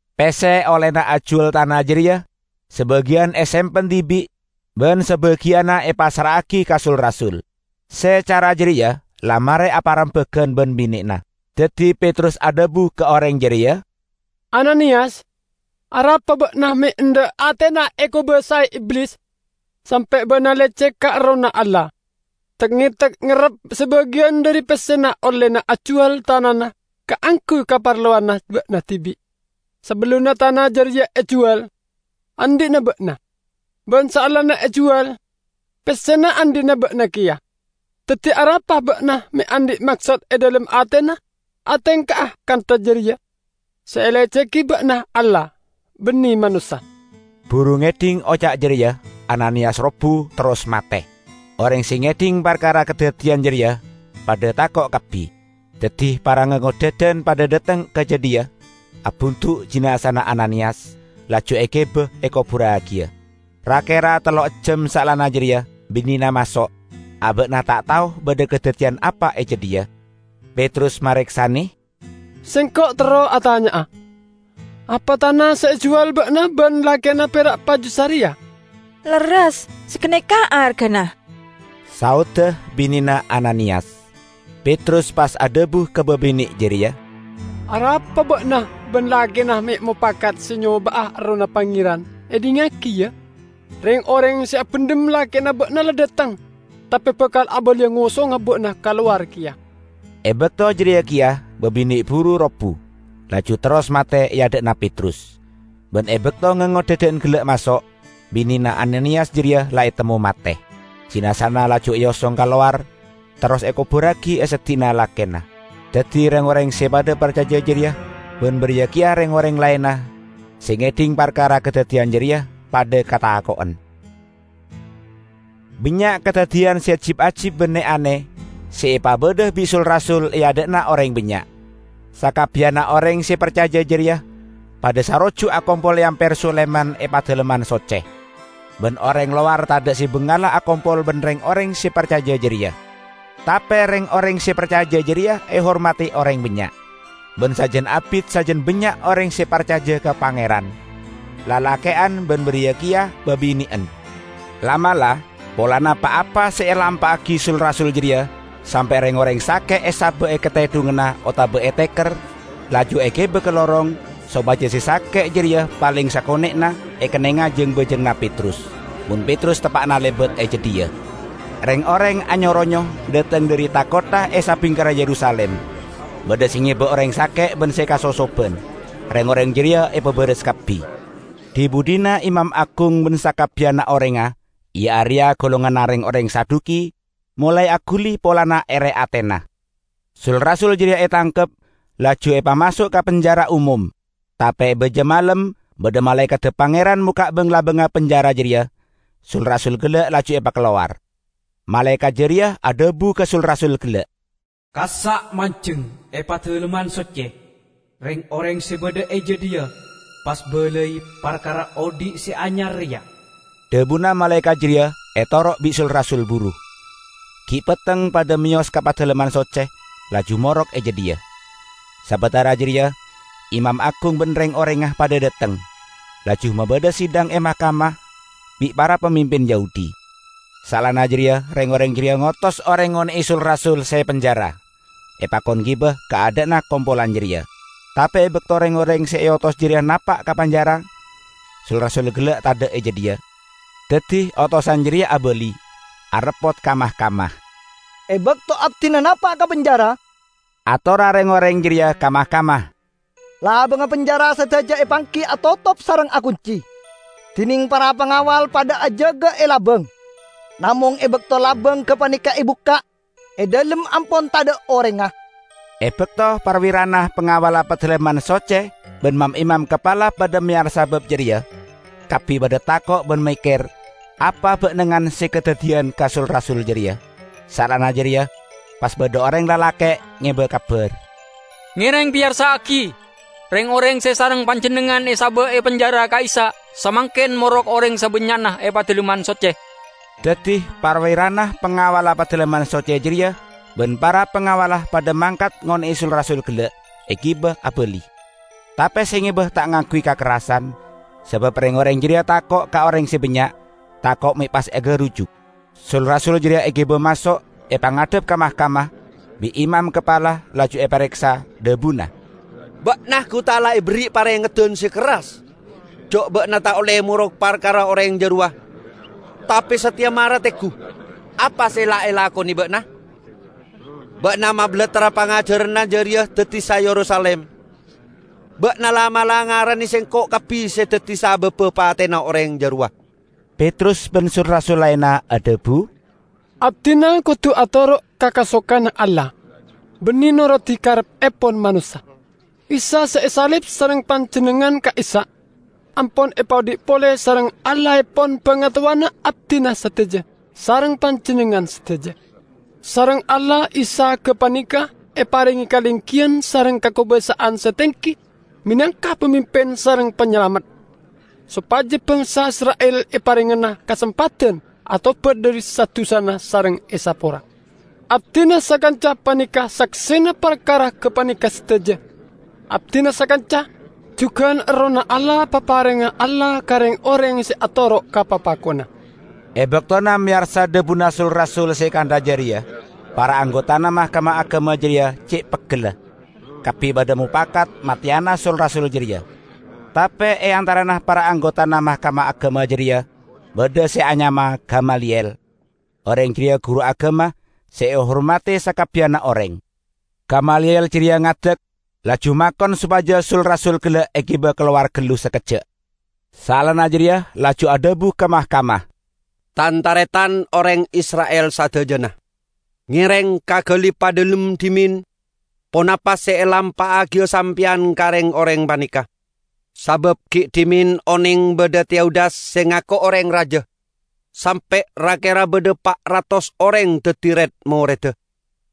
Pesse ollena ajuwal tana jareya sabagiyan esempen dibi' ban sabagiyanna epassra'agi ka sul-rasul. Se cara jareya la mare aparembagan ban binena. Daddi Petrus adhabu ka oreng jareya, "Ananiyas, arapa ba'na me' endha' atena ekobasae Iblis, sampe' ba'na lecek ka Errohna Allah, tek-ngetek ngerrep sabagiyan dhari pessena ollena ajuwal tanana kaangguy kaparlowanna ba'na dibi'? Sabellunna tana jareya ejuwal, andhi'na ba'na. Ban saellana ejuwal, pessena andhi'na ba'na keya. Daddi arapa ba'na me' andhi' maksod e dhalem atena atengka'a kantha jareya? Se elecegi ba'na Allah, banne manossa!" Buru ngedhing oca' jareya Ananiyas robbu, terros mate. Oreng se ngedhing parkara kadaddiyan jareya padha tako' kabbi. Daddi para ngangodhadan padha dhateng ka jadhiya, abundu' jinazana Ananiyas, laju egiba ekoburragiya. Ra-kera tello ejjam saellana jareya, binena maso'. Aba'na ta' tao badha kadaddiyan apa e jadhiya. Petrus mareksane, "Sengko' terro atanya'a: Apa tana se ejuwal ba'na ban lakena pera' paju sareya?" "Lerres, saganeka argana," saodda binena Ananiyas. Petrus pas adhabu ka babine' jareya, "Arapa ba'na ban lakena me' mopakat se nyoba'a Errohna Pangeran? Edhingngagi, ya! Reng-oreng se abendhem lakena ba'na la dhateng, tape bakal abaliya ngosonga ba'na kalowar keya." E bakto jareya keya babine' buru robbu, laju terros mate e adha'na Petrus. Ban e bakto ngangodhadan gella' maso', binena Ananiyas jareya la etemmo mate. Jinazana laju eosong kalowar, terros ekoburragi e seddi'na lakena. Daddi reng-oreng se padha parcaja jareya, ban bariya keya reng-oreng laenna, se ngedhing parkara kadaddiyan jareya, padha katako'en. Bannya' kadaddiyan se jib-ajib ban ne-ane se epabadha bi' sul-rasul e adha'na oreng bannya'. Sakabbiyanna oreng se parcaja jareya padha saroju' akompol e Amper Sulaiman e Padalemman Socce. Ban oreng lowar tadha' se bangala akompol ban reng-oreng se parcaja jareya. Tape reng-oreng se parcaja jareya ehormadi oreng bannya'. Ban sajan abit sajan bannya' oreng se parcaja ka Pangeran, lalake'an ban bariya keya babine'en. La'-mala', polana pa-apa se elampa'agi sul-rasul jareya, sampe' reng-oreng sake' esaba' e katedhunganna otabana e teker, laju egiba ka lorong, sopaja se sake' jareya paleng sakone'na ekennenga jang-bajanganna Petrus, mon Petrus teppa'na lebat e jadhiya. Reng-oreng anyo-ronyo dhateng dhari tha-kottha e sabingkerra Yerusalim. Badha se ngeba oreng sake' ban se kasosoban. Reng-oreng jareya epabaras kabbi. Dhi-budhina imam agung ban sakabbiyanna orengnga, iya areya golonganna reng-oreng Saduki, molae aguli polana ere atena. Sul-rasul jareya etangkep, laju epamaso' ka penjara omom. Tape e baja malem badha malaekadda Pangeran mokka' bang-labangnga penjara jareya, sul-rasul gella' laju epakalowar. Malaekat jareya adhabu ka sul-rasul gella', "Kassa' manjeng e Padalemman Socce; reng-oreng se badha e jadhiya pas balai parkara odhi' se anyar reya." Dhabuna malaekat jareya etoro' bi' sul-rasul buru. Gi' petteng padha meyos ka Padalemman Socce, laju morok e jadhiya. Sabatara jareya imam agung ban reng-orengnga padha dhateng, laju mabadha sidang e mahkamah bi' para pamimpin Yahudi. Saellana jareya reng-oreng jareya ngotos oreng ngone'e sul-rasul se penjara, epakon giba ka adha'anna kompolan jareya. Tape e bakto reng-oreng se eotos jareya napa' ka penjara, sul-rasul gella' tadha' e jadhiya. Daddi otosan jareya abali, areppot ka mahkamah. "E bakto abdina napa' ka penjara," atorra reng-oreng jareya ka mahkamah, "labangnga penjara sadaja epanggi atotop sareng akunci, dineng para pangawal padha ajaga e labang. Namong e bakto labang gapaneka ebukka', e dhalem ampon tadha' orengnga." E bakto parwirana pangawalla Padalemman Socce ban mam-imam kapala padha meyarsa bab jareya, kabbi padha tako' ban mekker apa ba'nengan se kadaddiyan ka sul-rasul jareya. Saellana jareya pas badha oreng lalake' ngeba kabar. "Ngereng peyarsa'agi! Reng-oreng se sareng panjennengngan esaba' e penjara ka'issa' samangken morok oreng sabannya'na e Padalemman Socce!" Daddi parwirana pangawalla Padalemman Socce jareya ban para pangawalla padha mangkat ngone'e sul-rasul gella', egiba abali. Tape se ngeba ta' ngangguy kakerrasan, sabab reng-oreng jareya tako' ka oreng se bannya', tako' me' pas egarujuk. Sul-rasul jareya egiba maso' epangadhep ka mahkamah. Bi' imam kapala laju epareksa, dhabuna, "Ba'na gu ta' la eberri' parengeddan se kerras ja' ba'na ta' olle morok parkara Oreng jarowa. Tape sateya mara tenggu apa se la elakone ba'na! Ba'na mabalattra pangajaranna jareya daddi sa Yerusalim; ba'na la'-mala' ngarane sengko' kabbi se daddi sababba patena Oreng jarowa." Petrus ban sul-rasul laenna adhabu, "Abdina kodu atoro' ka kasokanna Allah, banne norodi kareppepon manossa. Isa se esalib sareng panjennengngan ka'issa', ampon epaodhi' pole sareng Allahepon bangatowana abdina sadaja sareng panjennengngan sadaja. Sareng Allah Isa gapaneka eparenge kalenggiyan sareng kakobasa'an se tenggi menangka Pamimpin sareng Panyalamet; sopaja bangsa Isra'il eparengngana kasempadan atobat dhari sa-dusana sareng esapora. Abdina sakanca paneka saksena parkara gapaneka sadaja, abdina sakanca, jugan Errohna Allah paparengnga Allah ka reng-oreng se atoro' ka papakonna." E baktona meyarsa dhabuna sul-rasul se kantha jareya, para anggotana mahkamah agama jareya ce' peggella; kabbi padha mopakat mateyana sul-rasul jareya. Tape e antarana para anggotana mahkamah agama jareya badha se anyama Gamaliyel. Oreng jareya guru agama se ehormadi sakabbiyanna oreng. Gamaliyel jareya ngadek, laju makon sopaja sul-rasul gella' egiba kalowar gallu sakejja'. Saellana jareya laju adhabu ka mahkamah, "Tan-taretan oreng Isra'il sadajana! Ngereng kagali padhalem dhimen ponapa se elampa'agiya sampeyan ka reng-oreng paneka. Sabab gi' dhimen oneng badha Teudas se ngako oreng raja, sampe' ra-kera badha pa' ratos oreng daddi red-moredda.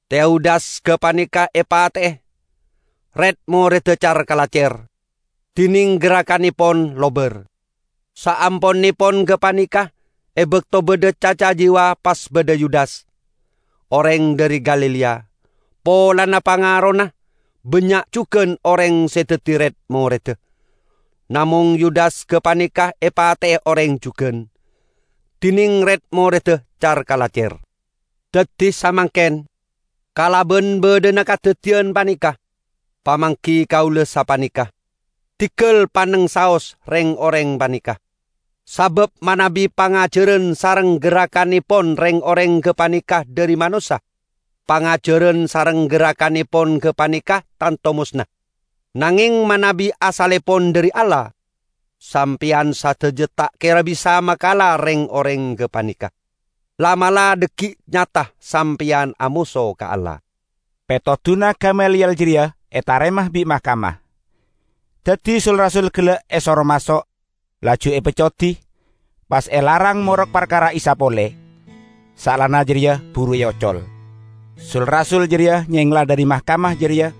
Teudas gapaneka epate'e, red-moredda car-kalacer, dineng gerrakannepon lobar. Saamponnepon gapaneka, e bakto badha caca jiwa pas badha Yudas, oreng dhari Galilea. Polana pangarona, bannya' jugan oreng se daddi red-moredda. Namong Yudas gapaneka epate'e oreng jugan, dineng red-moredda car-kalacer. Daddi samangken, kalaban badhana kadaddiyan paneka, pamanggi kaula sapaneka: diggal panneng saos reng-oreng paneka. Sabab manabi pangajaran sareng gerrakannepon reng-oreng gapaneka dhari manossa, pangajaran sareng gerrakannepon gapaneka tanto mosna. Nangeng manabi asallepon dhari Allah, sampeyan sadaja ta' kera bisa makala reng-oreng gapaneka. La'-mala' dhaggi' nyata sampeyan amoso ka Allah." Petoduna Gamaliyel jareya etarema bi' mahkamah. Daddi sul-rasul gella' esoro maso', laju epeccodi, pas elarang morok parkara Isa pole. Saellana jareya buru eocol. Sul-rasul jareya nyengla dhari mahkamah jareya,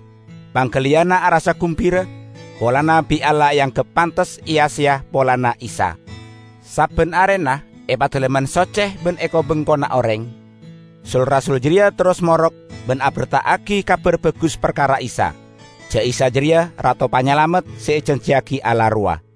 panggaliyanna arassa gumbira polana bi' Allah eanggep pantes eya-seya polana Isa. Sabban arena e Padalemman Socce ban e ko-bengkona oreng, sul-rasul jareya terros morok ban aberta'agi Kabar Bagus parkara Isa ja' Isa jareya Rato Panyalamet se ejanjiyagi Allah rowa.